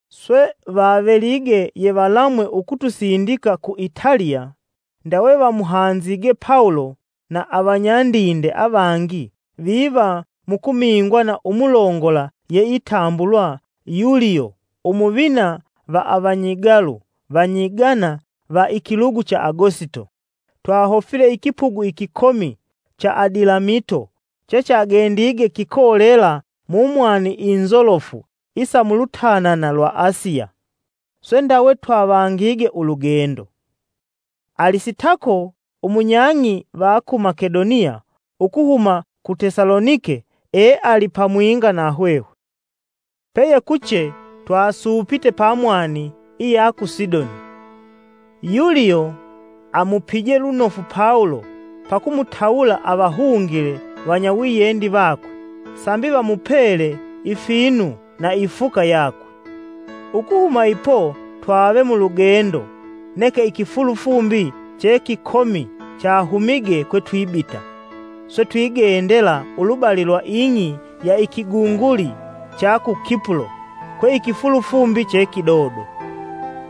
Swe vavelige yevalamwe ukutusindika ku Italiya, ndawe vamuhanzige Pawulo na avanyandinde avangi viva mukumingwa na umulongola yeitambulwa, “Yuliyo umuvina va Avanyigalu vanyigana va ikilugu cha Agosito.” Twahofile ikipugu ikikomi cha Adilamito chechagendige kikolela mumwani inzolofu isa mulutanana lwa Asiya, swe ndawe twavangige ulugendo. Alisitako umunyang'i va ku Makedoniya ukuhuma ku Tesalonike eali pamwinga na hwehwe. Peyekuche twasuupite pa mwani iya ku Sidoni. Yuliyo amupije lunofu Pawulo pa kumutawula avahungile vanyawiyendi vakwe sambi vamupele ifinu na ifuka yakwe. Ukuhuma ipo twave mulugendo neke ikifulufumbi chekikomi chahumige kwetubita, swe twigendela ulubali lwa ing'i ya ikigunguli cha ku Kipulo kwe ikifulufumbi chekidodo.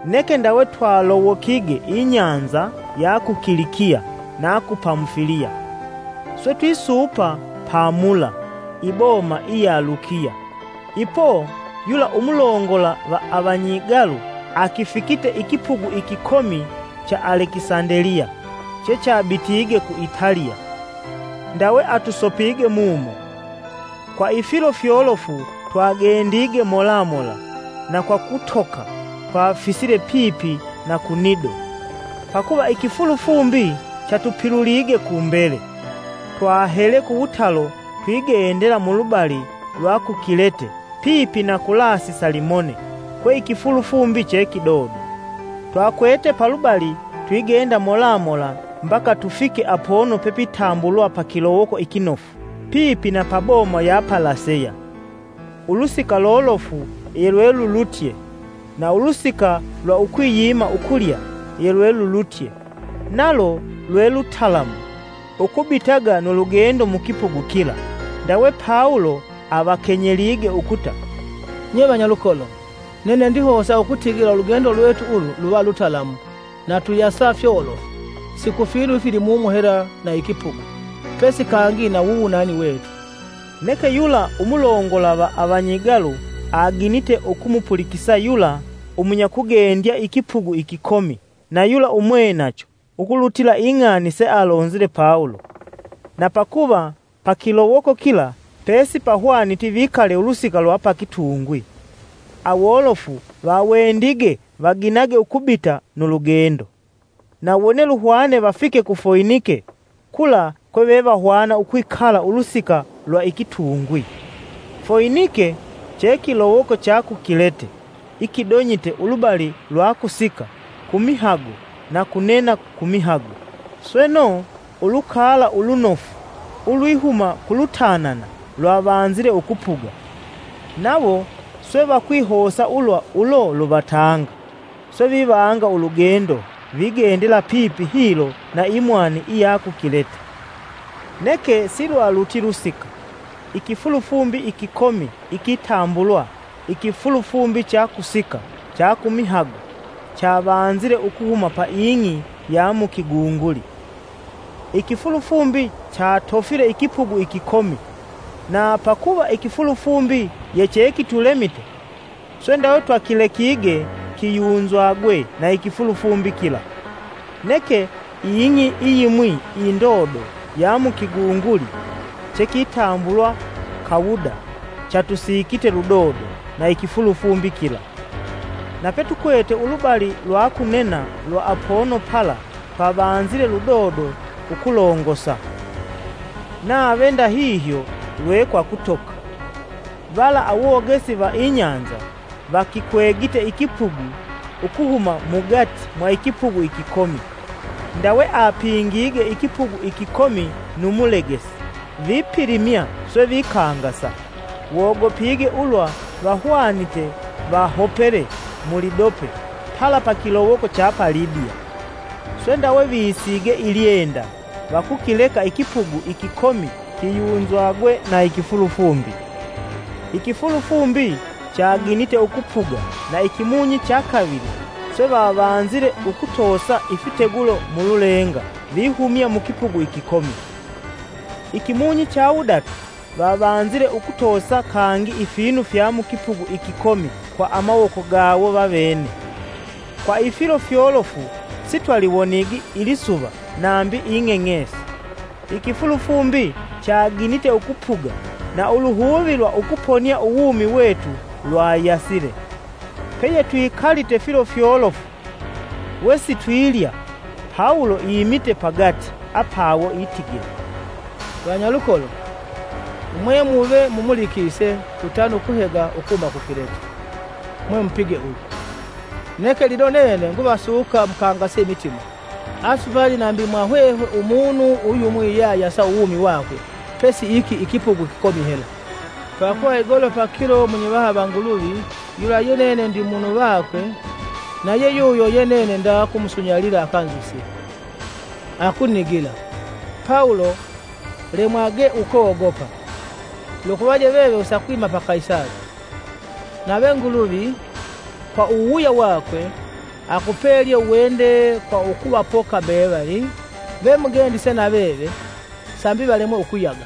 Neke ndawe twalowokige ibahali ya ku Kilikiya na ku Pamufiliya, swe twisuupa pa Mula, iboma iya Lukiya. Ipo yula umulongola va avanyigalu akifikite ikipugu ikikomi cha Alekisandeliya chechabitige ku Italiya, ndawe atusopige mumo. Kwa ifilo fyolofu twagendige mola mola na kwa kutoka twafisile pipi na ku Nido. Pakuva ikifulufumbi chatupilulige kumbele, twahele kuwutalo twigendela mulubali lwa ku Kilete pipi na ku Lasi Salimone kwe ikifulufumbi che kidodo. Twakwete palubali twigenda mola mola mbaka tufike apono pepitambulwa, “Pa kilowoko ikinofu.” Pipi na pa boma ya Laseya. Ulusika lolofu yelwelulutye, na ulusika lwa ukwiyima ukulya yelwelulutye. Nalo lwe lutalamu ukubitaga nu lugendo mukipugu kila, ndawe Pawulo avakenyelige ukuta, “Nye vanyalukolo, nene ndihosa ukutigila ulugendo lwetu ulu luva lutalamu na tuyasa fyolofu si kufinu ifilimumu hela na ikipugu, pesi kangi na wuwunani wetu.” Neke yula umulongola va avanyigalu aginite ukumupulikisa yula umunyakugendya ikipugu ikikomi na yula umwenacho ukulutila ing'ani sealonzile Pawulo. Na pakuva pa kilowoko kila pesipahwaniti vikale ulusika lwa pakitungwi, awolofu vawendige vaginage ukubita nu lugendo, na wone luhwane vafike ku Foinike, kula kwe vevahwana ukwikala ulusika lwa ikitungwi. Foinike che kilowoko cha ku Kilete ikidonyite ulubali lwa kusika kumihago na kunena kumihago. Sweno, ulukala ulunofu ulwihuma kulutanana lwavanzile ukupuga, nawo swe vakwihosa ulwa ulo luvatanga; swe vivanga ulugendo vigendela pipi hilo na imwani iya ku Kilete. Neke silwaluti lusika, ikifulufumbi ikikomi ikitambulwa, “Ikifulufumbi cha ku Kusika cha kumihago.” Chavanzile kihuma pa ing'i ya mu kigunguli. Ikifulufumbi chatofile ikipugu ikikomi, na pakuva ikifulufumbi yechekitulemite swe ndawe twakilekige kiyunzwage na ikifulufumbi kila. Neke ing'i iyimwi indodo ya mu kigunguli chekitambulwa Kawuda chatusikite ludodo na ikifulufumbi kila; na petukwete ulubali lwa kunena lwa apono pala twavanzile ludodo ukulongosa, nave ndahihyo ye kwa kutoka. Vala awogesi va ibahali vakikwegite ikipugu ukuhuma mugati mwa ikipugu ikikomi, ndawe apingige ikipugu ikikomi nu mulegesi vipilimya swe vikangasa, wogopige ulwa vahwanite vahopele mulidope pala pa kilowoko cha Libiya. Swe ndawe visige ilyenda vakukileka ikipugu ikikomi kiyunzwage na ikifulufumbi. Ikifulufumbi chaginite ukupuga na ikimunyi chakavili swe vavanzile ukutosa ifitegulo mululenga vihumya mukipugu ikikomi. Ikimunyi chawudatu, vavanzile ukutosa kangi ifinu fya mukipugu ikikomi kwa amawoko gawo vawene. Kwa ifilo fyolofu sitwaliwonigi ilisuva nambi ing'eng'esi, ikifulufumbi chaginite ukupuga na uluhuvi lwa ukuponia uwumi wetu lwayasile. Peyetwikalite filo fyolofu wesitwilya, Pawulo imite pagati apawo, itigila, “Vanyalukolo, mwemuve mumulikise tutane ukuhega ukuhuma ku Kilete, mwemupige ulu. Neke lino nene nguvasuka mukangase imitima; asupali nambi mwa hwehwe umunu uyumwi yeayasa uwumi wakwe pesi iki ikipugu ikikomi hela. Pakuva igolo pakilo munyivaha va Nguluvi yula ye nene ndi munu vakwe na yeyuyo ye nene nda kumusunyalila akanzusye, akunigila: ‘Pawulo, lemwage ukogopa! Lukuvaje veve usakwima pa Kaisali; nave Nguluvi, kwa uwuwuya wakwe, akupelye uwende kwa ukuvapoka mbevali vemugendise na veve sambi valemwe ukuyaga.’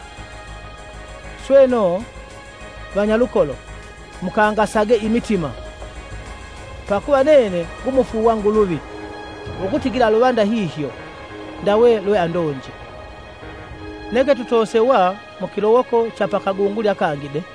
Sweno, Vanyalukolo, mukangasage imitima! Pakuva nene ngumufuuwa Nguluvi ukutigila luva ndahihyo ndawe lweandonje. Neke tutosewa mukilowoko cha pa kagunguli akangi de.”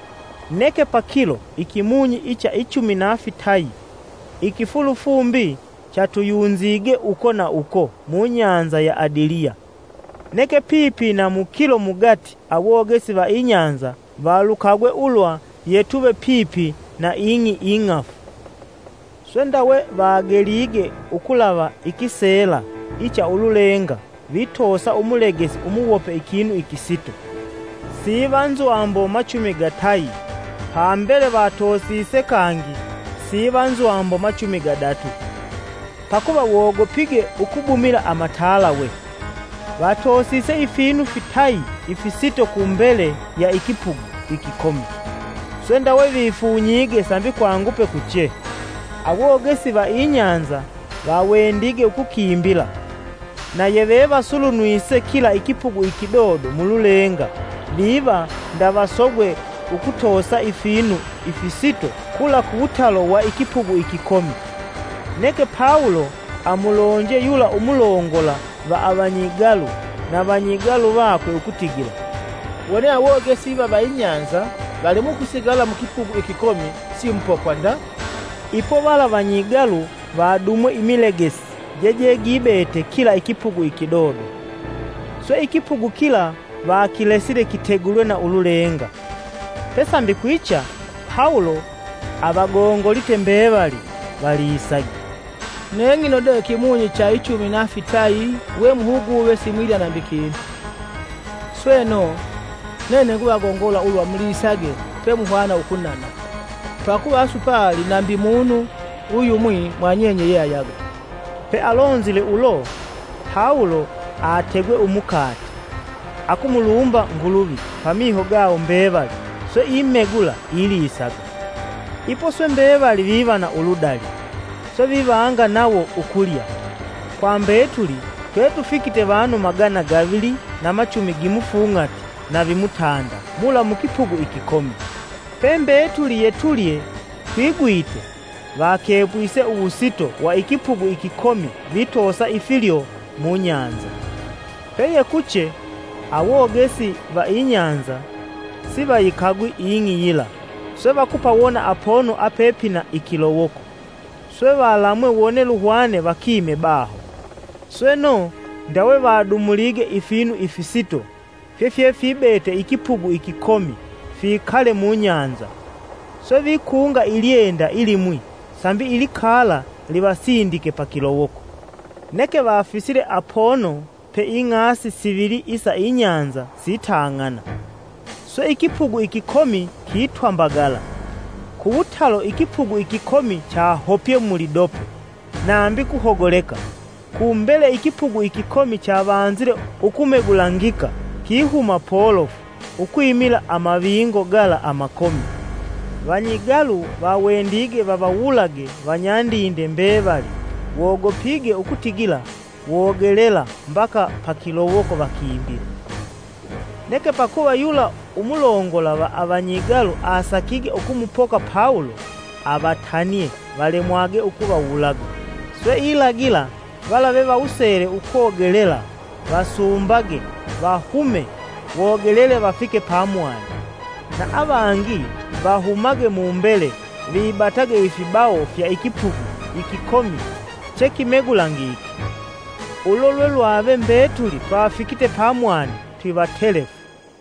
Neke pakilo ikimunyi icha ichumi na fitayi, ikifulufumbi chatuyunzige uko na uko mubahali ya Adiliya. Neke pipi na mukilo mugati awogesi va ibahali valukagwe ulwa tuve twipipi na ing'i ing'afu. Swe ndawe vagelige ukulava ikiseela icha ululenga vitoosa umulegesi umuwope ikinu ikisito, vapatite nzwambo machumi gatayi. Pambele vatoosise kangi vipata nzwambo machumi gadatu. Pakuva wogopige ukubumila amatalawe, vatosise ifinu fitayi ifisito kumbele ya ikipugu ikikomi; swe ndawe vifunyige sambi kwangupe kuche. Awogesi va ibahali vawendige ukukimbila, na yevevasulunwise kila ikipugu ikidodo mululenga viva ndavasogwe ukutosa ifinu ifisito kula kuwutalo wa ikipugu ikikomi. Neke Pawulo amulonje yula umulongola va avanyigalu na vanyigalu vakwe ukutigila, “Wone awogesi iva va ibahali valemwe ukusigala mu ikipugu ikikomi, simupokwa nda.” Ipo vala vanyigalu vadumwe imilegesi jejegibete kila ikipugu ikidodo, swe ikipugu kila vakilesile kitegulwe na ululenga. Pesambi kwicha, Pawulo avagongolite mbevali valisage, “Neng'ino de kimunyi cha ichumi na fitayi we muhuguve simwilya nambi kinu. Sweno, nene nguvagongola ulwa mulisage pemuhwana ukunana. Pakuva asupali nambi munu uyumwi mwa nyenye yeayaga.” Pealonzile ulo, Pawulo aategwe umukate, akumulumba Nguluvi pamiho gawo mbevali, swe imegula, ilisaga. Ipo swe mbevali viva na uludali, swe ivanga nawo ukulya. Kwa mbetuli twetufikite vanu magana gavili na machumi gimufung'ati na vimutanda mula mukipugu ikikomi. Pembetuli yetulye twigwite, vakepwise uwusito wa ikipugu ikikomi vitosa ifilyo mubahali. Peyekuche, awogesi va ibahali sivayikagwi ing'i yila, swe vakupawona apono apepina ikilowoko; swe valamwe wone luhwane vakime baho. Sweno, ndawe vadumulige ifinu ifisito fyefyefibete ikipugu ikikomi fikale mubahali, swe vikunga ilyenda ilimwi, sambi ilikala livasindike pa kilowoko. Neke vafisile apono pe ing'asi sivili isa ibahali sitang'ana, swe ikipugu ikikomi kitwambagala. Kuwutalo ikipugu ikikomi chahopye mulidope nambi kuhogoleka kumbele ikipugu ikikomi chavanzile ukumegulangika kihuma polofu ukwimila amavingo gala amakomi. Vanyigalu vawendige vavawulage vanyandinde mbevali wogopige ukutigila wogelela mbaka pakilowoko vakimbile. Neke pakuva yula umulongola va avanyigalu asakige ukumupoka Pawulo, avatanie valemwage ukuvawulaga. Swe ilagila vala vevawusele ukogelela vasumbage vahume wogelele vafike pamwani, na avangi vahumage mumbele vibatage ifibawo fya ikipugu ikikomi chekimegulangike. Ulo lwelwave mbetuli twafikite pamwani twivatelefu.